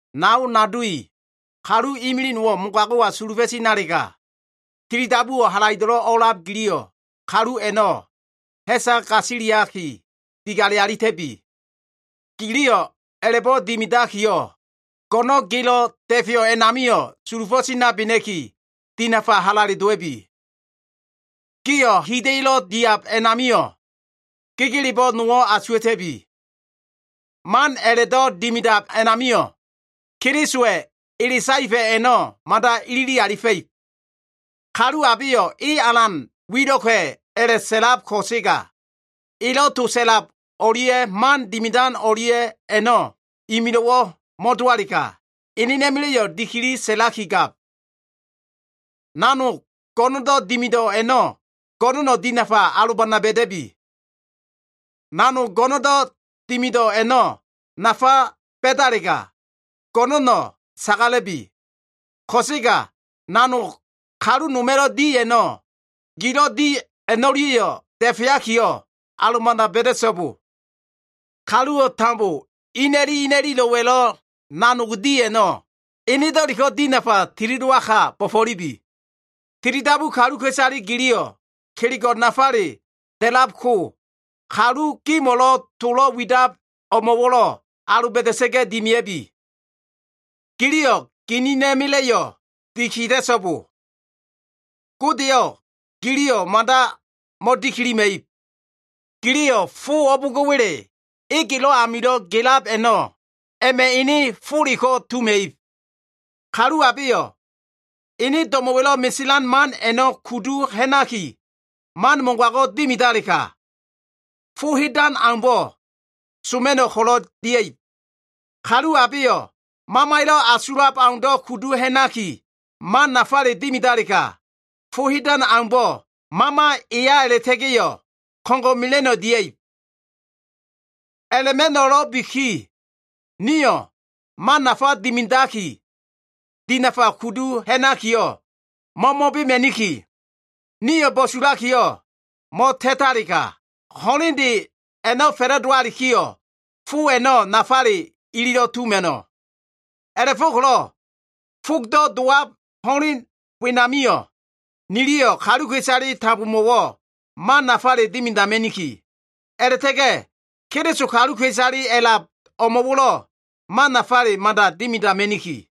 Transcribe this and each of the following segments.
Nao nado i, kalu imilig nowo꞉ mogago꞉wa sulufo꞉ tinalega, tilidabuwo꞉ halaido꞉lo꞉ o꞉a꞉lab giliyo꞉, kalu a꞉no꞉ ha꞉sa gasiliaki, digale alita꞉bi. Giliyo꞉ a꞉la꞉bo꞉ dimidakiyo꞉, go꞉no꞉n gelo꞉ da꞉feyo꞉ a꞉namio꞉ sulufo꞉ tinabena꞉ki, dinafa halale dowa꞉bi. Gio꞉ hida꞉yo꞉lo꞉ diab amio꞉, gegelebo꞉ nowo꞉ asuwa꞉ta꞉bi. Man a꞉la꞉do꞉ dimidab a꞉namio꞉, Kelisowa꞉ ele saefa꞉ a꞉no꞉ mada ilili alifa꞉ib. Kalu abeyo꞉ e alan wilo꞉ka꞉ a꞉la꞉sa꞉lab ko꞉sega, elo꞉ to sa꞉lab o꞉lia꞉ man dimidan o꞉lia꞉ a꞉no꞉ imilo꞉wo꞉ mo꞉dowalega, enena꞉ma꞉la꞉yo꞉ dikili sa꞉laki gab. Nanog go꞉no꞉ndo꞉ dimido꞉ a꞉no꞉ go꞉no꞉no꞉ dinafa alobana ba꞉da꞉bi. Nanog go꞉no꞉ndo꞉ dimido꞉ a꞉no꞉ nafa ba꞉dalega, go꞉no꞉no꞉ sagala꞉bi. Ko꞉sega nanog kalu noma꞉lo꞉ di a꞉no꞉, gilo꞉ di a꞉no꞉lia꞉yo꞉ da꞉feakiyo꞉, alobana ba꞉da꞉so꞉bo. Kaluwo꞉ tambo ina꞉li ina꞉lilo꞉wa꞉lo꞉ nanog di a꞉no꞉, enedo꞉leko꞉ dinafa tilidowaka bo꞉fo꞉lubi. Tilidabu kaluka꞉isale giliyo꞉ kelego꞉ nafale da꞉labko, kalu gimo꞉lo꞉ tolo꞉ widab o꞉mo꞉wo꞉lo꞉ aloba꞉da꞉sa꞉ga꞉ dimia꞉bi. Giliyo꞉ ginina꞉ma꞉la꞉yo꞉ dikida꞉so꞉bo. Godeyo꞉ giliyo꞉ mada mo꞉dikilima꞉ib. Giliyo꞉ fo o꞉bo꞉ngo꞉wa꞉le egelo꞉ amilo꞉ gelab a꞉no꞉, a꞉ma꞉ ene foleko꞉ tuma꞉ib. Kalu abeyo꞉ ene do꞉mo꞉wa꞉lo꞉ meselan man a꞉no꞉ kudu ha꞉naki, man mogago꞉ dimidalega, fo hedan aumbo꞉ soma꞉no꞉ ko꞉lo꞉ dia꞉ib. Kalu abeyo꞉ Mamaya꞉lo꞉ asulab au kudu ha꞉nakiyo꞉, man nafale dimidalega, fo hedan aumbo꞉ Mama eya a꞉la꞉ta꞉ga꞉yo꞉ ko꞉ngo꞉ mela꞉no꞉ dia꞉ib. A꞉la꞉ma꞉no꞉lo꞉biki, nio꞉ man nafa dimidaki, dinafa kudu ha꞉nakiyo꞉, mo꞉mo꞉bema꞉niki. Nio꞉ bo꞉sulakiyo꞉ mo꞉ta꞉talega, ho꞉lende a꞉no꞉ fa꞉la꞉dowalikiyo꞉, fo a꞉no꞉ nafale ililo꞉ tuma꞉no꞉. A꞉la꞉fo꞉ko꞉lo꞉ fogdo꞉ dowab ho꞉len wenamio꞉, niliyo꞉ kaluka꞉isale tambomo꞉wo꞉ man nafale dimidama꞉niki. A꞉la꞉ta꞉ga꞉ Keliso kaluka꞉isale a꞉lab o꞉mo꞉wo꞉lo꞉ man nafale mada dimidama꞉niki.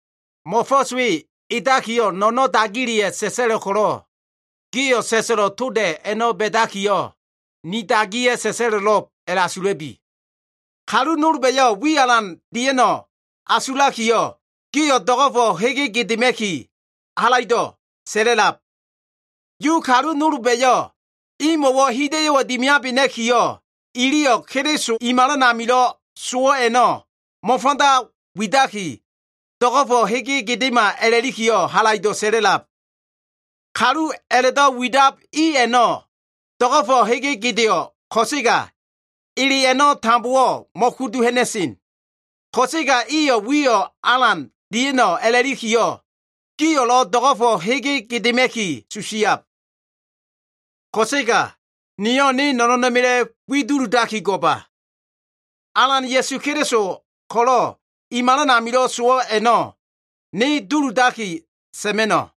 Mo꞉fo꞉s we edakiyo꞉, no꞉no꞉n dagileya꞉ sa꞉sa꞉lo꞉ ko꞉lo꞉, gio꞉ sa꞉sa꞉lo꞉ toda꞉ a꞉no꞉ ba꞉dakiyo꞉, ni dagiya꞉ sa꞉sa꞉lo꞉lo꞉b a꞉la꞉asula꞉bi. Kalu nolba꞉yo꞉ wi alan dia꞉no꞉ a꞉la꞉asulakiyo꞉, gio꞉ do꞉go꞉fo꞉ hege gedema꞉ki halaido꞉ sa꞉la꞉lab. Yu kalu nolba꞉yo꞉ imo꞉wo꞉ hida꞉yo꞉ dimiabena꞉kiyo꞉, iliyo꞉ Keliso i malan amilo꞉ sowo꞉ a꞉no꞉ mo꞉fanda widaki, do꞉go꞉fo꞉ hege gedema a꞉lakiyo꞉ halaido꞉ sa꞉la꞉lab. Kalu a꞉la꞉do꞉ widab i a꞉no꞉ do꞉go꞉fo꞉ hege gedeo꞉ ko꞉sega, ele a꞉no꞉ tambowo꞉ mo꞉kudu ha꞉na꞉sen. Ko꞉sega iyo꞉ wiyo꞉ alan dia꞉no꞉ a꞉lakiyo꞉, giyo꞉lo꞉ do꞉go꞉fo꞉ hege gedema꞉ki susiab. Ko꞉sega niyo꞉ ne no꞉no꞉na꞉ma꞉la꞉ wi duludaki go꞉ba. Alan Ya꞉su Keliso ko꞉lo꞉ i malan amilo꞉ sowo꞉ a꞉no꞉ ne duludaki sa꞉ma꞉no꞉.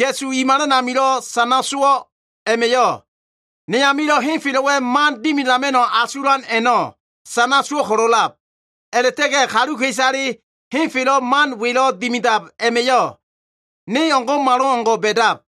Ya꞉su i malan amilo꞉ sana sowo꞉ a꞉ma꞉yo꞉, ne amilo꞉ henfelo꞉wa꞉ man dimidama꞉no꞉ asulan a꞉no꞉ sana sowo꞉ ko꞉lo꞉ a꞉lab. A꞉la꞉ta꞉ga꞉ kaluka꞉isale henfelo꞉ man welo꞉ dimidab a꞉ma꞉yo꞉ ne o꞉ngo꞉malo꞉ngo꞉ ba꞉dab.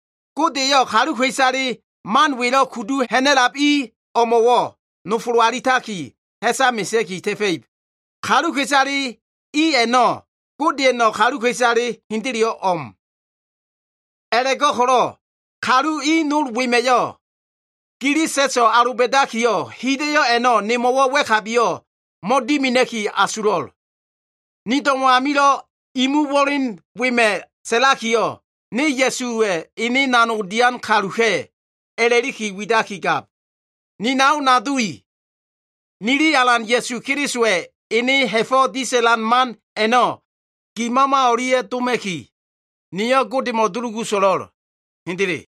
Gode eyo꞉ kaluka꞉isale man welo꞉ kudu ha꞉na꞉lab i o꞉mo꞉wo꞉ nofolo alitaki, ha꞉sa mesea꞉ki ta꞉fa꞉ib. Kaluka꞉isale i a꞉no꞉ Godeya꞉no꞉ kaluka꞉isale hendeleyo꞉ o꞉m. A꞉la꞉go꞉ko꞉lo꞉ kalu i nol wema꞉yo꞉ gili sa꞉so꞉ aloba꞉dakiyo꞉, hida꞉yo꞉ a꞉no꞉ nemo꞉wo꞉ wa꞉kabiyo꞉ mo꞉dimina꞉ki asulo꞉l. Ni do꞉mo꞉ amilo꞉ imu wo꞉len wema꞉ sa꞉lakiyo꞉, ne Ya꞉suwa꞉ ene nanog dian kaluka꞉ a꞉la꞉liki widakigab. Ni nao nado i, nili Alan Ya꞉su Kelisowa꞉ ene ha꞉fo꞉ disa꞉lan man a꞉no꞉ gi mama o꞉lia꞉ doma꞉ki, niyo꞉ Godemo꞉ dulugu so꞉lo꞉l. Hendele.